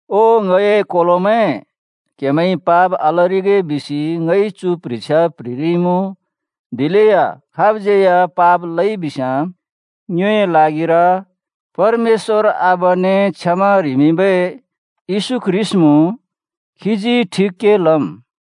ओ ङए कोलोमैं, क्‍हेमैंइ पाप आलरिगे बिसि ङइ चु प्ह्रिछ्या प्‍ह्रिरिइमुँ। दिलेया खाबज्‍यै या पाप लइबिस्‍याँ ङ्योए ल्हागिर परमेश्‍वर आबाने क्षमा ह्रिमिंबै येशू ख्रीष्‍ट मुँ। खीजी ठिक के लम्।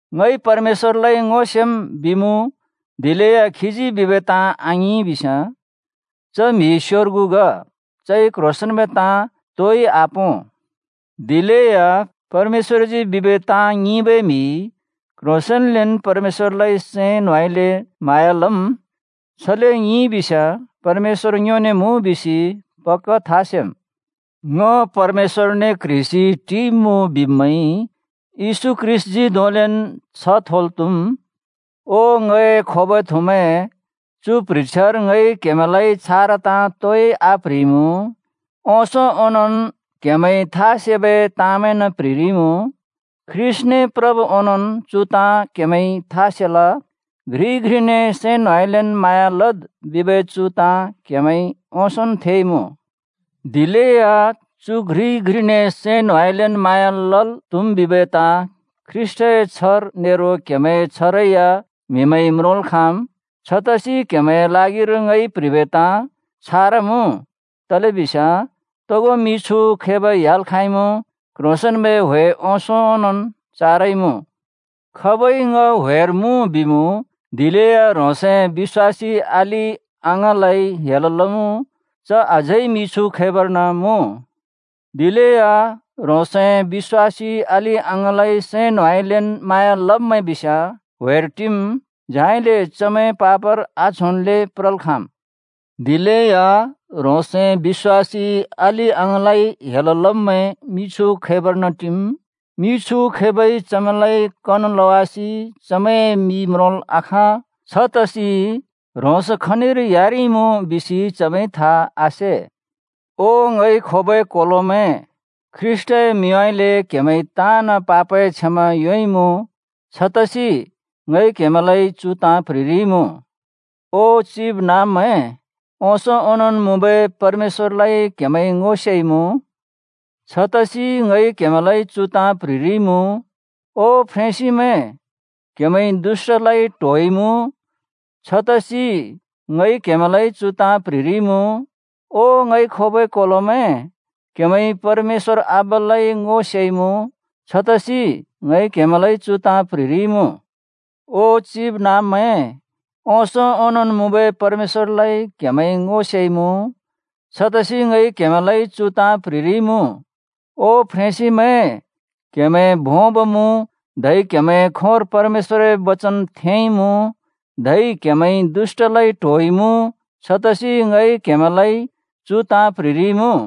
“ङइ परमेश्‍वरलाइ ङो सेम्,” बिमुँ, दिलेया खीजी बिबै ताँ आङिं बिस्याँ, च म्‍हि स्‍योर्गु ग, चइ क्ह्रोंसेंन्बै ताँ तोइ आपों। दिलेया परमेश्‍वरजी बिबै ताँ ङिंबै म्हिइ क्‍ह्रोंसेंन्लेन् परमेश्‍वरलाइ सैं न्होंउँइँलेन् म्हाँया लम्। छले ङिंइबिस्‍याँ परमेश्‍वर ङ्योने मुँ बिसि पक्‍का था सेम्। “ङ परमेश्‍वरने क्ह्रिसि टिइमुँ” बिब्मैंइ येशू ख्रीष्‍टजी धोंलेन् छ्ह थोल् त्‍हुम्। ओ ङए खोबै थुमैं, चु प्ह्रिछ्यार ङइ क्‍हेमैंलाइ छारा ताँ तोइ आप्‍ह्रिइमुँ, ओंसों ओंनोंन् क्हेमैंने था सेबै ताँमैंन् प्‍ह्रिरिइमुँ। ख्रीष्‍टने प्रब् ओनोंन् चु ताँ क्‍हेमैंइ था सेल। “घ्रिइ घ्रिने सैं न्होंउँइँलेन् म्हाँया लद्” बिबै चु ताँ क्‍हेमैंइ ओंसोंन् थेइमुँ। दिलेया चु घ्रिइ घ्रिने सैं न्होंउँइँलेन् म्हाँया लल् त्हुम् बिबै ताँ ख्रीष्‍टए छ्हर नेरो क्‍हेमैंए छ्हरै या म्‍हिमैंइ म्रोंल् खाँम्। छतसि क्हेमैंए ल्हागिर ङइ प्ह्रिबै ताँ छारा मुँ। तलेबिस्याँ तोगो मिछु खैब ह्‍याल् खाँइमुँ, क्ह्रोंसेंन्‍बै ह्‍वे ओंसों ओंनोंन् चारइमुँ। खाबइ “ङ ह्‍वेर मुँ” बिमुँ, दिलेया ह्रोंसए बिश्‍वासी अलि-अङाँलाइ हेल लमुँ, च अझै मिछु खैबर्न मुँ। दिलेया ह्रोंसए बिश्‍वासी अलि-अङाँलाइ सैं न्होंउँइँलेन् म्हाँया लब्मैं बिस्याँ ह्‍वेर टिम्, झाइले चमैं पापर आच्होल्‍ले प्रल् खाँम्। दिलेया ह्रोंसए बिश्‍वासी अलि-अङाँलाइ हेल लब्मैं मिछु खैबर्न टिम्। मिछु खैबइ चमैंलाइ कन लवासि चमैंए मि म्रोंल् आखाँ, छतसि ह्रोंस खनिर ह्‍यारिइमुँ बिसि चमैंइ था आसे। ओ ङइ खोबै कोलोमैं, ख्रीष्‍टए मिंउँइँले क्‍हेमैंइ ताँन् पापए क्षमा योंइमुँ, छतसि ङइ क्हेमैंलाइ चु ताँ प्‍ह्रिरिइमुँ। ओ चिबनाँब्मैं, ओंसों ओंनोंन् मुँबै परमेश्‍वरलाइ क्‍हेमैंइ ङो सेइमुँ, छतसि ङइ क्हेमैंलाइ चु ताँ प्‍ह्रिरिइमुँ। ओ फ्रेंसिमैं, क्‍हेमैंइ दुष्‍टलाइ ट्होइमुँ, छतसि ङइ क्हेमैंलाइ चु ताँ प्‍ह्रिरिइमुँ। ओ ङइ खोबै कोलोमैं, क्‍हेमैंइ परमेश्‍वर आबालाइ ङो सेइमुँ, छतसि ङइ क्हेमैंलाइ चु ताँ प्‍ह्रिरिइमुँ। ओ चिबनाँब्मैं, ओंसों ओंनोंन् मुँबै परमेश्‍वरलाइ क्‍हेमैंइ ङो सेइमुँ, छतसि ङइ क्हेमैंलाइ चु ताँ प्‍ह्रिरिइमुँ। ओ फ्रेंसिमैं, क्‍हेमैं भोंब मुँ, धै क्‍हेमैंए खोंर परमेश्‍वरए बचन थेंइमुँ, धै क्‍हेमैंइ दुष्‍टलाइ ट्होइमुँ, छतसि ङइ क्हेमैंलाइ चु ताँ प्‍ह्रिरिइमुँ।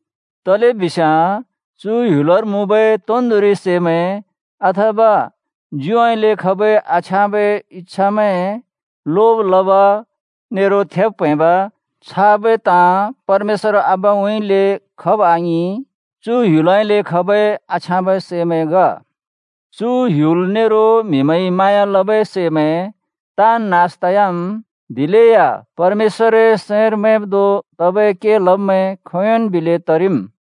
तलेबिस्याँ चु ह्‍युलर मुँबै तोन्दोंरि सैमैं, अथवा ज्युउँइँले खबै आछ्याँबै इच्छामैं, लोब लब, नेरो थेब् प्‍हैंब, छाबै ताँ परमेश्‍वर आबाउँइँले खब आङिं, चु ह्‍युलउँइँले खबै आछ्याँबै सैमैं ग। चु ह्‍युल नेरो म्‍हिमैंइ म्हाँया लबै सैमैं ताँन् नास तयाम्, दिलेया परमेश्‍वरए सैंर मैंब् धों तबै के लब्मैं खोंयोंन् बिलै तरिम्।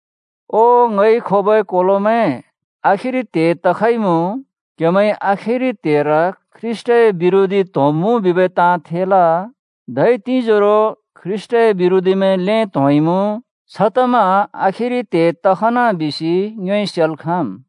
ओ ङइ खोबै कोलोमैं, आखिरि त्हे तखइमुँ। क्‍हेमैंइ “आखिरि त्हेर ख्रीष्‍टए बिरोधी त्‍होंब्‍मुँ” बिबै ताँ थेल। धै तिंजोरो ख्रीष्‍टए बिरोधीमैं ल्‍हें त्‍होंइमुँ। छतमा आखिरि त्हे तखन बिसि ङ्योइ सेल् खाँम्।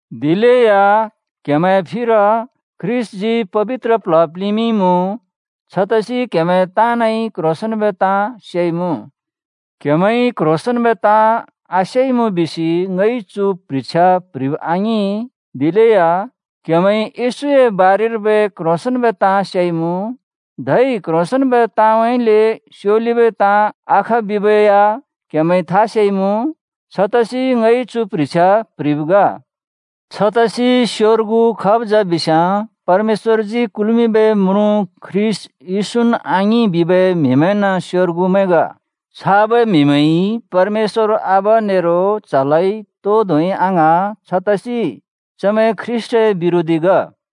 दिलेया क्‍हेमैंए फिर ख्रीष्‍टजी पबित्र प्ल्ह प्लिंमिंइमुँ, छतसि क्‍हेमैं ताँनइ क्ह्रोंसेंन्बै ताँ सेइमुँ। क्‍हेमैंइ क्ह्रोंसेंन्बै ताँ आसेइमुँ बिसि ङइ चु प्ह्रिछ्या प्‍ह्रिब आङिं, दिलेया क्‍हेमैंइ येशूए बारेर्बै क्ह्रोंसेंन्बै ताँ सेइमुँ। धै क्ह्रोंसेंन्बै ताँउँइँले स्योलिबै ताँ आख बिबै या क्‍हेमैंइ था सेइमुँ। छतसि ङइ चु प्ह्रिछ्या प्‍ह्रिब् ग। छतसि स्‍योर्गु खाब् जा बिस्‍याँ “परमेश्‍वरजी कुल्मिंबै म्रुँ ख्रीष्‍ट येशून् आङिं” बिबै म्हिमैंन् स्‍योर्गुमैं ग। छाबै म्हिमैं परमेश्‍वर आबा नेरो च्‍हलाइ तो धोंइ आङ्हाँ, छतसि चमैं ख्रीष्‍टए बिरोधी ग।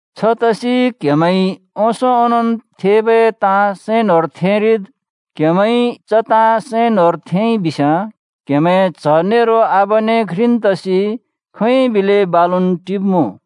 छतसि क्‍हेमैंइ ओंसों ओनोंन् थेबै ताँ सैं न्‍होंर थेंरिद्। क्‍हेमैंइ च ताँ सैं न्‍होंर थेंइ बिस्‍याँ क्‍हेमैं च्‍ह नेरो आबाने घ्रिन् तसि खोंयोंन् बिलै बालुन् टिब्‍मुँ।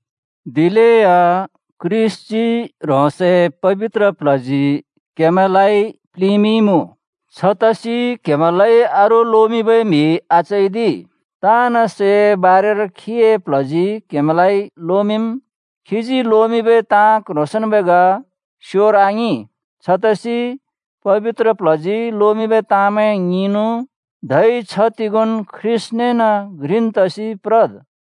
दिलेया ख्रीष्‍टजी ह्रोंसए पबित्र प्ल्हजी क्‍हेमैंलाइ प्लिंमिंइमुँ, छतसि क्‍हेमैंलाइ अरू लोमिंबै म्‍हि आचैदि। ताँन् सैए बारेर खीए प्ल्हजी क्‍हेमैंलाइ लोमिंम्, खीजी लोमिंबै ताँ क्ह्रोंसेंन्बै ग, स्‍योर आङिं। छतसि पबित्र प्ल्हजी लोमिंबै ताँमैं ङिंनु, धै छ्ह तिगोंन् ख्रीष्‍टनेन् घ्रिन् तसि प्रद्।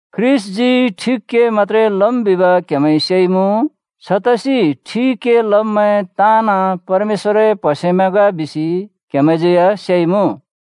ख्रीष्‍टजी ठिक के मत्‍त्रे लम् बिब क्‍हेमैंइ सेइमुँ। छतसि ठिक के लब्मैं ताँन् परमेश्‍वरए प्‍हसेमैं ग बिसि क्‍हेमैंज्यै या सेइमुँ।